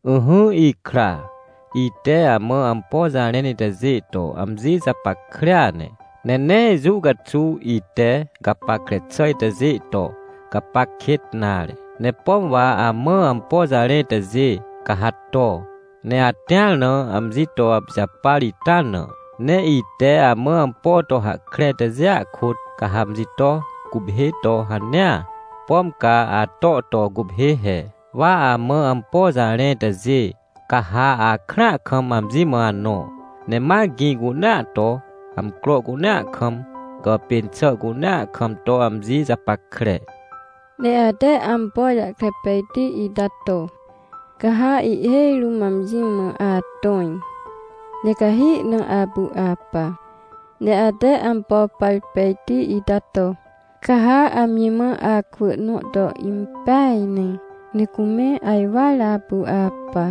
Ỹhỹ ikra, ite amã ampo jarẽn itajê to amji japackrea ne, ne nee jũ caxuw ite gapackre xà itajê to gapac kêt nare. Ne pom wa amã ampo jarẽ itajê, ca ha to, ne atĩar na amji to apijapar ita na. Ne ite amã ampo to hahkre itajêa kôt, ca ha amji to guphê to hanea, pom ca ato to guphê he. Wa amã ampo jarẽ itajê, ca ha akrãa kam amji mã anõ, ne ma gĩ cunea to, amcro cunea kam, gàpên xà cunea kam to amji japackre. Ne ate ampo jahkre pejti ita to, ca ha ihhêj rũm amji mã atõj, ne cahi na apu apa. Ne ate ampo par pejti ita to, ca ha amji mã akwỳ nõ to impeaj ne, ne cume ajwar apu apa.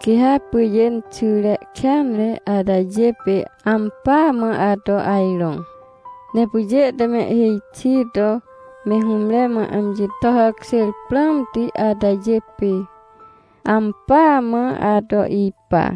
Quê ha pyjê inxyre kêanre atajê pê ampỳa mã ato ajrõ. Ne pyjê te mehhêj xi to me hũmre mã amji to hàkjêr prãmti atajê pê, ampỳa mã ato ipa.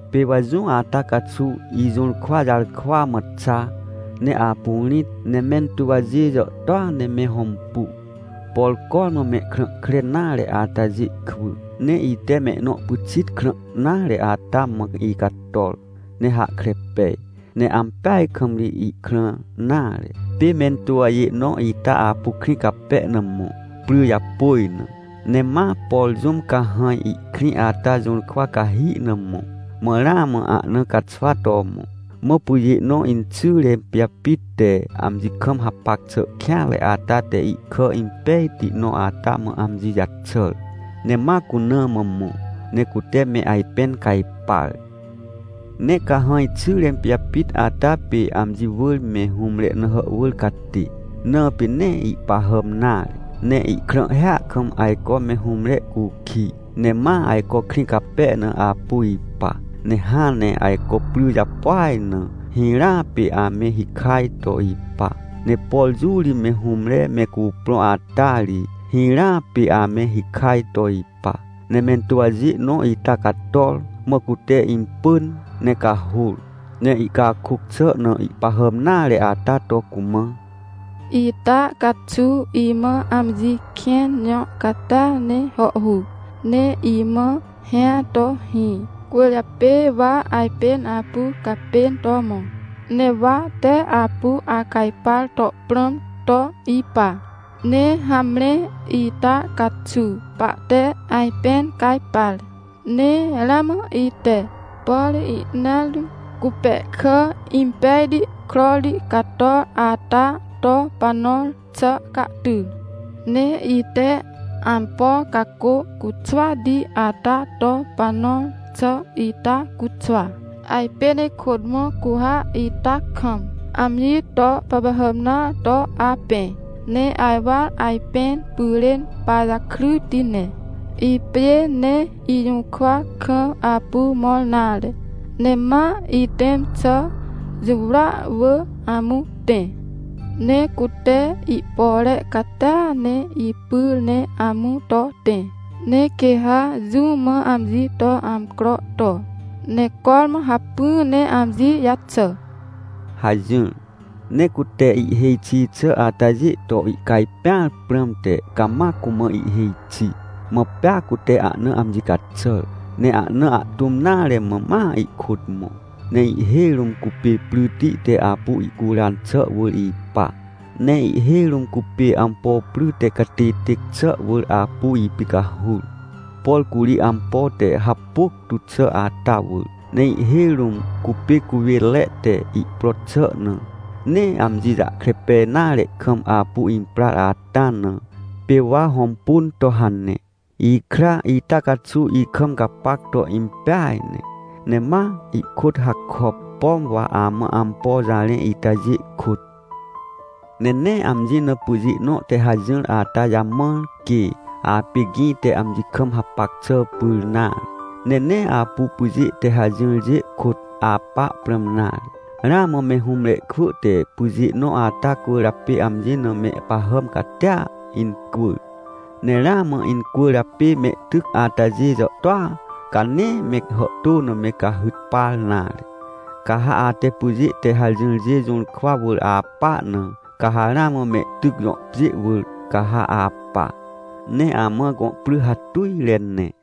Pê wa jũ ata caxuw ijũrkwa jarkwa mã xa, ne apu rĩt. Ne mentuwjê jàhtôa ne me hõmpu, por cormã mehkrã kre nare atajê kwỳ. Ne ite mehnõ pyxit krã nare ata mã icator ne hahkre pej, ne ampeaj kam ri ihkrã nare. Pê mentuwjê nõ ita apu krĩ cape na mõ, pry japôj na, ne ma, por jũm cahãj ihkrĩ ata jũrkwa cahi na mõ, mã ramã ahna caxwa to mõ. Mã pyjê nõ inxyre pijapit te amji kam hapac xà kêanre ata te ihkà impejti nõ ata mã amji jaxàr, ne ma cuna mã mõ, ne cute me ajpẽn cajpar. Ne cahãj xyre pijapit ata pê amji wỳr me hũmre na hàhwỳr catê, na pê nee ihpahàm nare, ne ihkrãhhia kam ajco me hũmre cukij, ne ma ajco krĩ cape na apu ipa. Ne hãn ne ajco pry japôaj na hirãa pê ame hikaj to ipa, ne por jũ ri me hũmre me cuprõ ata ri, hirãa pê ame hikaj to ipa. Ne mentuwjê nõ ita cator, mã cute impỳn ne cahôr, ne ihcakôc xà na ihpahàm nare ata to cumã: — Ita caxuw imã amji kĩn jõ catia ne hàhhuc, ne imã hĩa to hĩ. Cwỳrjapê wa ajpên apu gapên to mõ. Ne wa tee apu acajpar to prãm to ipa. Ne hamre, ita caxuw pahte ajpẽn cajpar! Ne ramã ite, por ihneat rũm cupẽhkà impejti krorti cator ata to panõr xà cahty. Ne ite ampo cacô cuxwati ata to panõr xà ita cuxwa. Ajpên ikôt mõ, cu ha ita kam amji to pahpahàm nõa to apẽ, ne ajwar ajpẽn pyrên pajakryti ne. Ipjê nee ijũrkwa kam apu mõr nare, ne ma ihtẽm xà jũwrya wỳr amũ tẽ. Ne cute ihpore catia ne ipyr ne amũ to tẽ, ne quê ha jũ mã amji to amcro to, ne cormã hacpỹ ne amji jaxà — hajỹr. Ne cute ihhêj xi xà atajê to ihcajpẽar prãmte cama cumã ihhêj xi. Mã pea cute ahna amji caxàr. Ne ahna ahtũm nare mã ma ihkôt mõ, ne ihhêj rũm cupê pryti te apu ihcuran xà wỳr ipa, ne ihhêj rũm cupê ampo pry te catêtêc xà wỳr apu ipicahur. Por curi ampo te hapôc tu xà ata wỳr. Ne ihhêj rũm cupê cuwênre te ihpro xà na, nee amji jahkre pej nare kam apu imprar ata na, pê wa hõmpun to hane. Ikra, ita caxuw ikam gapac to impeaj ne, ne ma ihkôt hakop, pom wa amã ampo jarẽ itajê kôt. Ne nee amji na pyjê nõ te hajỹr ata jamãr quê apê gĩ te amji kam hapac xà pyr nare, ne nee apu pyjê te hajỹrjê kôt apa prãm nare. Ramã me hũmre kwỳ te pyjê nõ ata cwỳrjapê amji na mehpahàm catia incwỳr. Ne ramã incwỳrjapê mehtyc atajê jàhtôa, ca nee me hàhtô na me cahyt par nare. Ca ha ate pyjê te hajỹrjê jũrkwa wỳr apa na, ca ha ramã mehtyc jõ pjê wỳr, ca ha apa, ne amã gõ pry hatujre ne.